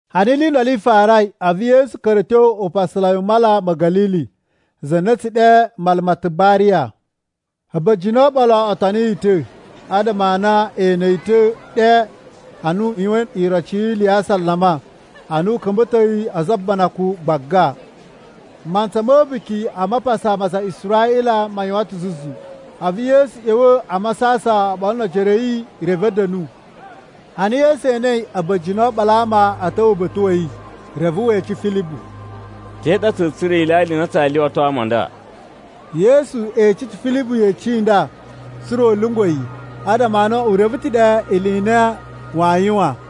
Ana ili i ndolo i farai, a̱vu Yesu ka̱ra̱ a̱ tyo upasalai u Mala ma̱ Ga̱lili (za na a̱ tsu ɗe Mala ma Tibariya). A̱ba̱jini o oɓolo o toni yi ta̱, adama a na e ene yi ta̱ ɗe ana u yuwain iroci yi ili ya asalama, ana u ka̱mba̱toi a̱za̱ o ubanakun gbaga. Mantsa ma̱ A̱buki a Mapasa ma aza a Israꞌila ma yuwan ta̱ zuzu, a̱vu Yesu ꞌya̱wa̱ a masasan oɓolo no ojoro a̱ yi, reve a̱ da̱nu. Ana Yesu enei a̱ba̱jini o oɓolo a ama a̱ ta̱wa̱ uba̱ta̱ wa̱ yi, reve we ece Filibu, “Te ɗa tsa̱a̱ tsura̱ ilyalya i na tsaa lyuwato ama a nda?” (Yesu ece ta̱ Filibu yeci i nda, tsa̱ra̱ u lyungwa̱ yi, adama a na u reve ta̱ ɗe ili i na waa yuwan.)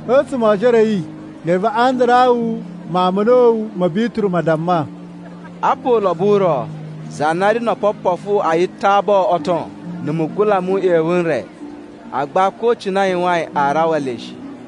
A̱tsuma̱ o ojoro a̱ yi, reve Andarawu mawun ma̱ a̱na̱wu ma̱ Bituru ma damma, “Apa ulobo u ro za na ri no opopofu a yitabo o ton na̱ mugula mu uꞌyewu n re. Agba ko cine a yuwain aa rawa le shi.”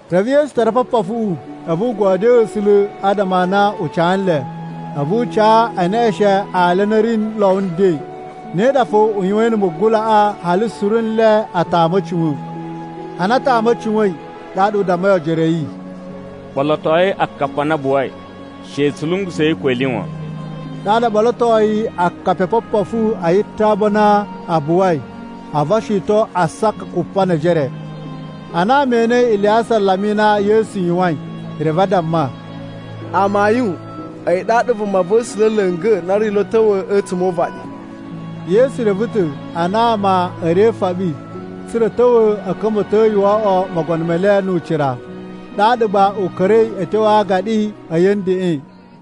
Reve Yesu tara opopofuꞌu, a̱vu u godyoo A̱sula̱ adama a na u ca nle. A̱vu u ca e neꞌeshen ali a na a̱ ri lo nden. Ne ɗa fo u yuwain na̱ mugulaꞌa, hali suru nle a tama a̱ cuwa̱n. Ana a tamai a̱ cuwa̱in, ɗaɗa u dammai ojoro a̱ yi, “Ɓolotoi akapi a na a buwai. She tsu lungusa̱i ko ili wan.” Ɗaɗa o ɓolotoi akapi o opopofu a yitabo a na a buwai, a̱vu o shiton asaka kupa ne ejere. Ana ama e enei ili ya asalama i na Yesu yuwain, reve a damma, “Amayun, a̱yi ɗaɗa Vumava̱sula̱ la̱nga̱ na ri lo a̱ ta̱wa̱ a̱tsuma̱ o uvaɗi.” Yesu reve ta̱ a na ama a̱ ri e ifoɓi tsa̱ra̱ a̱ ta̱wa̱ a̱ ka̱mba̱to yi wo oꞌwo mogono me le nu ucira, ɗaɗa gba u ka̱ra̱i a̱ tyo a agaɗi a̱yi a̱ ndeꞌen.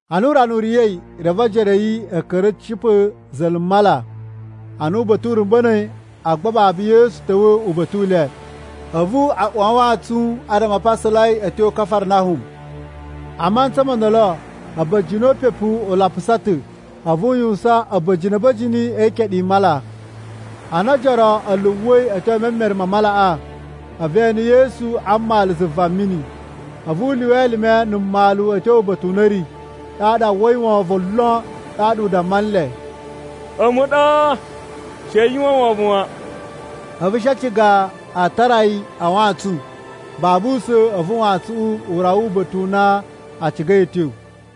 Ana urana u riya̱i, reve ojoro a̱ yi a̱ ka̱ra̱ a̱ cipa̱ za̱la̱ mala. Ana uba̱ta̱ u rumba̱na̱i, agba babu Yesu ta̱wa̱ uba̱ta̱ u le. A̱vu a uwa a wantsun adama a pasalai a̱ tyo Kafarnahum. A mantsa mo ndolo a̱ba̱jini o upepu a lapusa ta̱, a̱vu u yuwusan a̱ba̱jini a̱ba̱jini e ikeɗu i mala. Ana ojoro a̱ luwa̱i a̱ tyo e memere ma malaꞌa, a̱vu e ene Yesu a mmalu zuva mini. A̱vu u lyuwa elime na̱ mmalu a̱ tyo uba̱ta̱ u na a̱ ri, ɗaɗa a uwwai wovon lon. Ɗaɗa u damma nle, “A̱mu ɗa. She yu uwwa wovon wan.” A̱vu a̱ shi a ciga a tara yi a wantsun. Babu usa̱n, a̱vu wantsuꞌun u rawa uba̱ta̱ u na a cigai a̱ tyo.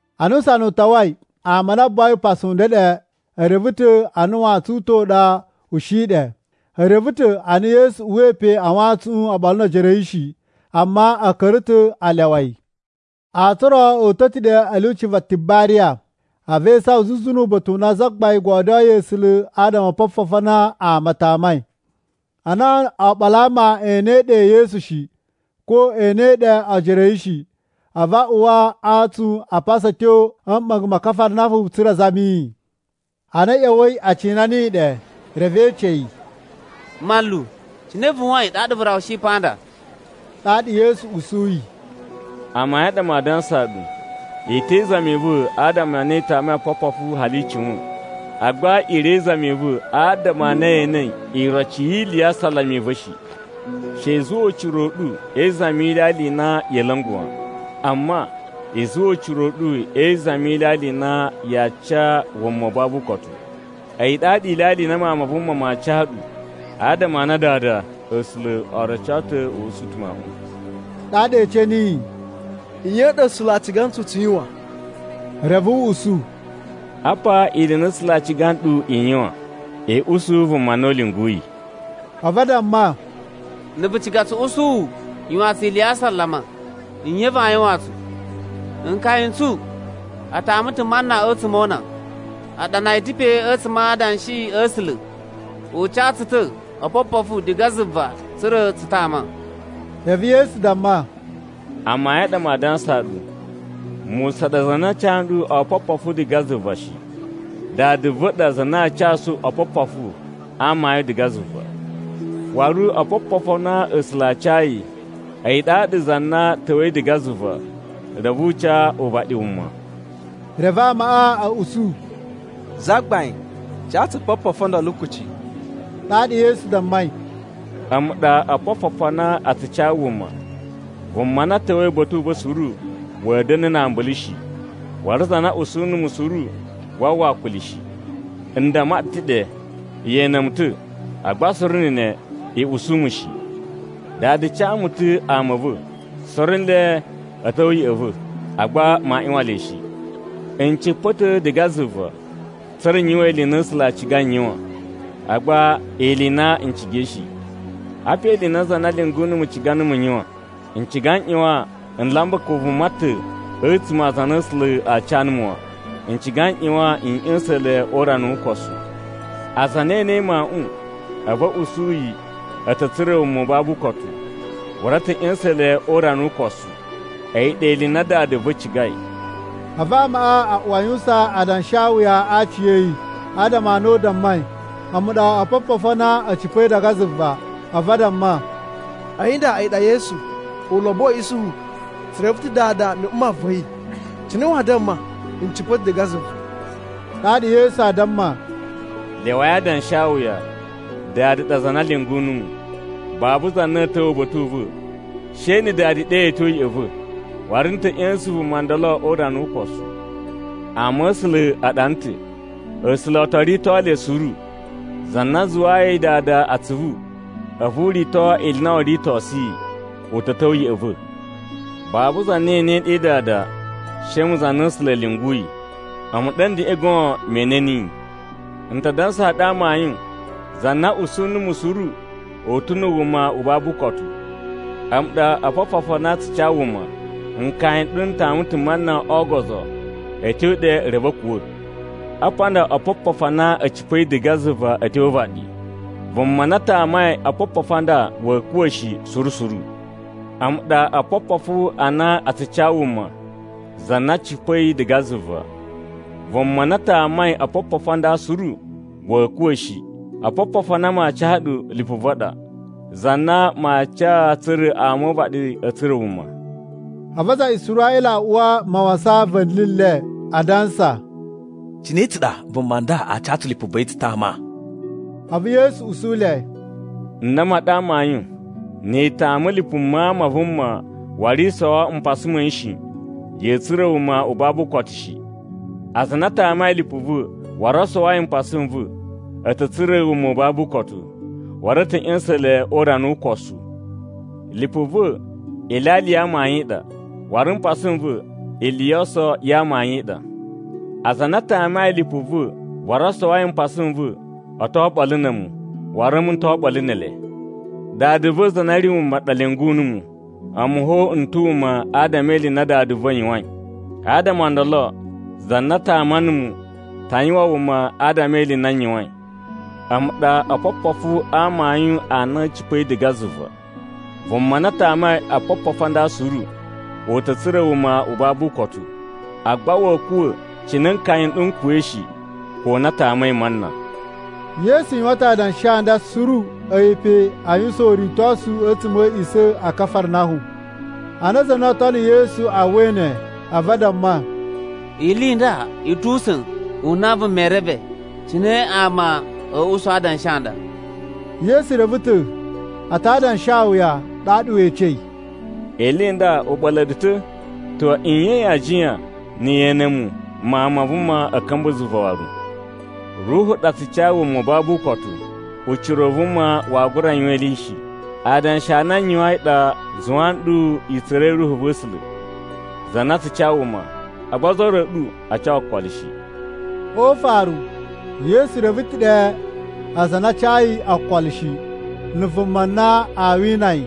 Ana usana u tawai, ama a na a buwai upasu u ndeɗe e reve ta̱ a na wantsun u ta̱ u ɗa u shi ɗe. E reve ta̱ a na Yesu uwai pe a wantsuꞌun oɓolo no ojoro a̱ yi shi, amma a̱ ka̱ra̱ ta̱ a lyawa yi. Antsun o ro o uta̱ ta̱ ɗe a̱ lyuci va Tibariya, a̱vu e isawan zuzu nu uba̱ta̱ u na Zagbain godyoyi A̱sula̱ adama o opopofu a na ama a tamai. Ana oɓolo a ama e enei ɗe Yesu shi, ko e enei ɗe ojoro a̱ yi shi, a̱vu a uwa a antsun a pasa a̱ tyo a̱ mɓa̱nga̱ ma Kafarnahum tsa̱ra̱ a zami yi. Ana a̱ ꞌya̱wa̱i a cina niyi ɗe, reve e ece yi, “Manlu, cine vu yuwain ɗaɗa vu rawushi pa nda?” Ɗaɗa Yesu usuyi, “Amayun a ɗa maa dansaa ɗu, i te izami i va̱ adama a na i tamai opopofu hali i cuwa̱in. Agba i ri e izami i va̱ adama a na ye enei iroci yi ili ya asalama i va̱ shi. She i zuwa ucira u ɗu e izami yi ilyalya i na ya̱a̱ la̱nga̱ wan. Amma, i zuwa ucira u ɗu e izami yi ilyalya i na yaa ca wuma u babu ukotu. A̱yi ɗaɗa ilyalya i na Mawun ma Vuma maa ca ɗu, adama a na Dada A̱sula̱ o roco ta̱ u usu ta̱ Mawuꞌun.” Ɗaɗa e ece niyi, “Nye i ɗa A̱sula̱ a ciga ntsu tsu yuwan?” Reve u usu, “Apa ili i na A̱sula̱ a ciga nɗu i yuwan: I usu vuma na u lyunguyi.” A̱vu a damma, “Na̱ vu ciga tsu usu wu, yuwaan tsu ili ya asalama. Nye vaa yuwaan tsu? Nkaya n tsu n tama ta̱ mana a̱tsuma̱ o una. A ɗana yi ta̱ pe a̱tsuma̱ a Adanshi a̱ A̱sula̱, ‘U ca tsu ta̱ opopofu diga zuva tsa̱ra̱ tsu tama.’” Reve Yesu damma, “Amayun a ɗa maa dansaa ɗu, Musa ɗa za na ca nɗu opopofu diga zuva shi. Dada va̱ ɗa za na aa casu opopofu a amayun diga zuva. Waru opopofu a na A̱sula̱ a cayi, a̱yi ɗaɗa za na ta̱wa̱i diga zuva reve u ca uvaɗi wuma.” Reve amaꞌa a̱ usu, “Zagbain, ca tsu opopofu o ndolo kuci.” Ɗaɗa Yesu dammai, “A̱mu ɗa opopofu a na a tsu ca wuma. Vuma na ta̱wa̱i uba̱ta̱ u va̱ suru wa̱a̱ da̱na̱ na ambulu shi, waru za na usu numu suru waa uwwa akuli shi. N damma ɗu ta̱ ɗe ye ene mu ta̱, agba suru na̱ ne i usu mu shi. Dada ca mu ta̱ ama a̱ va̱, suru nle a̱ ta̱wa̱ ya̱ꞌa̱ va̱, agba maa ꞌyuwan le shi. N cipa̱ ta̱ diga zuva tsa̱ra̱ n yuwan ili i na A̱sula̱ a cigai n yuwan, agba ili i na n cigai shi. Apa ili i na za na lyungu numu ciga numu n yuwan: N ciga n ꞌyuwan n lamba ko vuma ta̱ a̱tsuma̱ a aza a na A̱sula̱ a ca numu wan, n ciga n ꞌyuwan n ꞌya̱sa̱n le o urana wu ukosu. Aza a na e enei Mawuꞌun, a̱vu a̱ usu yi a̱ ta̱ tsura̱ wuma u babu ukotu, waru n ta̱ ꞌya̱sa̱n le o urana wu ukosu. A̱yi ɗa ili i na Dada va̱ cigai.” A̱vu ama a uwa a yuwusan adanshawuya a aci a̱ yi, adama a na u dammai, “A̱mu ɗa opopofu a na a̱ cipa̱i diga zuva.” A̱vu a damma, “A̱yi nda a̱yi ɗa Yesu, ulobo wa̱ Isuhu. Tsu reve ta̱ dada na̱ mma va̱ yi. Cine waa damma, ‘N cipa̱ ta̱ diga zuva?’” Ɗaɗa Yesu aa damma, “Lyawai adanshawuya. Dada ɗa za na lyungu numu. Babu za na a̱a̱ ta̱wa̱ uba̱ta̱ u va̱, she na̱ Dada ɗe yi a̱ tyo ya̱ꞌa̱ va̱, waru n ta̱ ꞌya̱sa̱n vuma ndolo o urana wu ukosu. Ama̱sula̱ a ɗana ta̱, ‘A̱sula̱ o to rito le suru.’ Za na zuwayi Dada atsuvu, a̱vu u rito ili i na woo ritosu yi, u ta̱ ta̱wa̱ ya̱ꞌa̱ va̱. Babu za na enei ɗe Dada, she a̱mu za na A̱sula̱ a̱ lyunguyi. A̱mu ɗa a̱ ndeꞌen goon me ene niyi. “N ta dansaa ɗu amayun, za na usu numu suru u ta̱ na̱ wuma u babu ukotu. A̱mu ɗa opopofu a na a tsu ca wuma. Nkaya n ɗu n tama ta̱ mana o ogozo, a̱ tyo ɗe reve a̱ kuwa̱. Apa nda opopofu a na a̱ cipa̱i diga zuva a̱ tyo o uvaɗi. Vuma na tamai opopofu a nda wa̱a̱ kuwa̱ shi suru suru. A̱mu ɗa opopofu a na a tsu ca wuma, za na cipa̱i diga zuva. Vuma na tamai opopofu a nda suru wa̱a̱ kuwa̱ shi. Opopofu a na maa ca ɗu lipu va̱ ɗa, za na maa ca tsa̱ra̱ ama o uvaɗi a̱ tsura̱ wuma.” A̱vu aza a Israꞌila a uwa mawasan va̱ni le, adansa, “Cine tsa ɗa vuma nda a ca tsu lipu va̱ yi tsu tama?” A̱vu Yesu usu le, “N damma ɗu amayun, ni i tama lipu Mawun ma Vuma waru i sowo mpasa ma̱ yi shi, ya̱a̱ tsura̱ wuma u babu ukotu shi. Aza a na a tamai lipu va̱ waru o sowoi mpasa n va̱, a̱ ta̱ tsura̱ wuma u babu ukotu, waru n ta̱ ꞌya̱sa̱n le o urana wu ukosu. Lipu va̱ ilyalya ya amayun i ɗa, waru mpasa n va̱ ili yo oso ya amayun i ɗa. Aza a na a tamai lipu va̱ waru o sowoi mpasa n va̱ o to oɓolo na̱ a̱mu, waru a̱mu n to oɓolo ne ele. Dada va̱ za na ri wuma ɗa lyungu numu, a̱mu fo n ta̱ wuma adama e ili i na Dada va̱ yuwain. Adama o ndolo, za na tama numu ta yuwan wuma adama e ili i na n yuwain. A̱mu ɗa opopofu a amayun a na a̱ cipa̱i diga zuva. Vuma na tamai opopofu a nda suru, u ta̱ tsura̱ wuma u babu ukotu. Agba wa̱a̱ kuwa̱ cine nkaya n ɗu n kuwa̱i shi, ko na a tamai mana.” Yesu yuwan ta̱ adanshi a nda suru a̱yi pe a yuwusan uritosu a̱tsuma̱ a̱ a̱a̱ꞌisa̱ a Kafarnahum. Ana aza a na oo tono Yesu a uwwai ne, a̱vu a damma, “Ili i nda i tu usa̱n u na vuma ee reve. Cine ama a̱ usu adanshi a nda?” Yesu reve ta̱ a ta adanshawuya. Ɗaɗa we ecei, “Ili i nda u ɓa̱la̱ ɗu ta̱? To nye yaa jiyan na̱ ye ene mu, Mawun ma Vuma, a̱ ka̱mba̱ zuva waru? Ruhu ɗa tsu ca wuma u babu ukotu. Ucira u vuma waa gura yuwan ili shi. Adanshi a na n yuwain ɗa a zuwa nɗu i tsura̱i Ruhu va̱ A̱sula̱, za na tsu ca wuma. Agba ozo o ro a̱ ɗu a ca okolo shi.” (O ufaru, Yesu reve ta̱ ɗe aza a na a cayi okolo shi, na̱ vuma na aa wina yi.)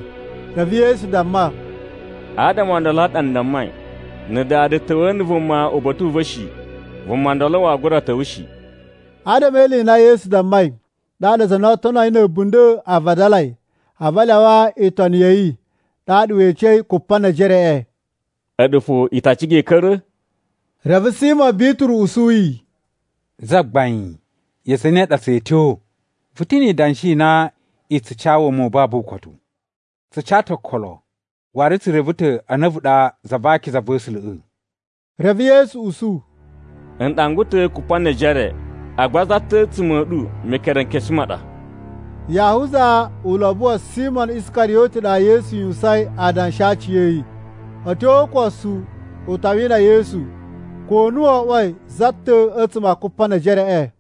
Reve Yesu damma, “Adama o ndolo a ɗa n dammai, ‘Na̱ Dada ta̱wa̱a̱ na̱ vuma uba̱ta̱ u va̱ shi, vuma ndolo waa gura ta̱wa̱ shi.’” Adama e ili i na Yesu dammai, ɗaɗa aza a na oo tono yi na̱ a̱bunda̱ a vadalai, a̱vu a lyawa itoni ya̱ yi. Ɗaɗa we ecei Kupanejereꞌe, “A̱ɗu fo i ta ciga i ka̱ra̱?” Reve Simo Bituru usu yi, “Zagbain, ya zane ɗa tsa̱a̱ tyo? Vu ta̱ ni idanshi i na i tsu ca wuma u babu ukotu. Tsu ca ta̱ okolo, waru tsu reve ta̱ a na a̱vu ɗa Za va Akiza va̱ A̱sula̱ꞌa̱.” Reve Yesu usu, “N ɗangwa ɗu ta̱ Kupanejere. Agba za ta̱ a̱tsuma̱ a̱ ɗu Mekerenkesu ma ɗa!” Yahuza ulobo wa̱ Simo Iskariyoti ɗa Yesu yuwusain adanshi a aci a̱ yi. A̱ tyo o ukosu u ta wina Yesu, ko na wo oꞌwoi za ta̱ ɗa a̱tsuma̱ a Kupanejereꞌe.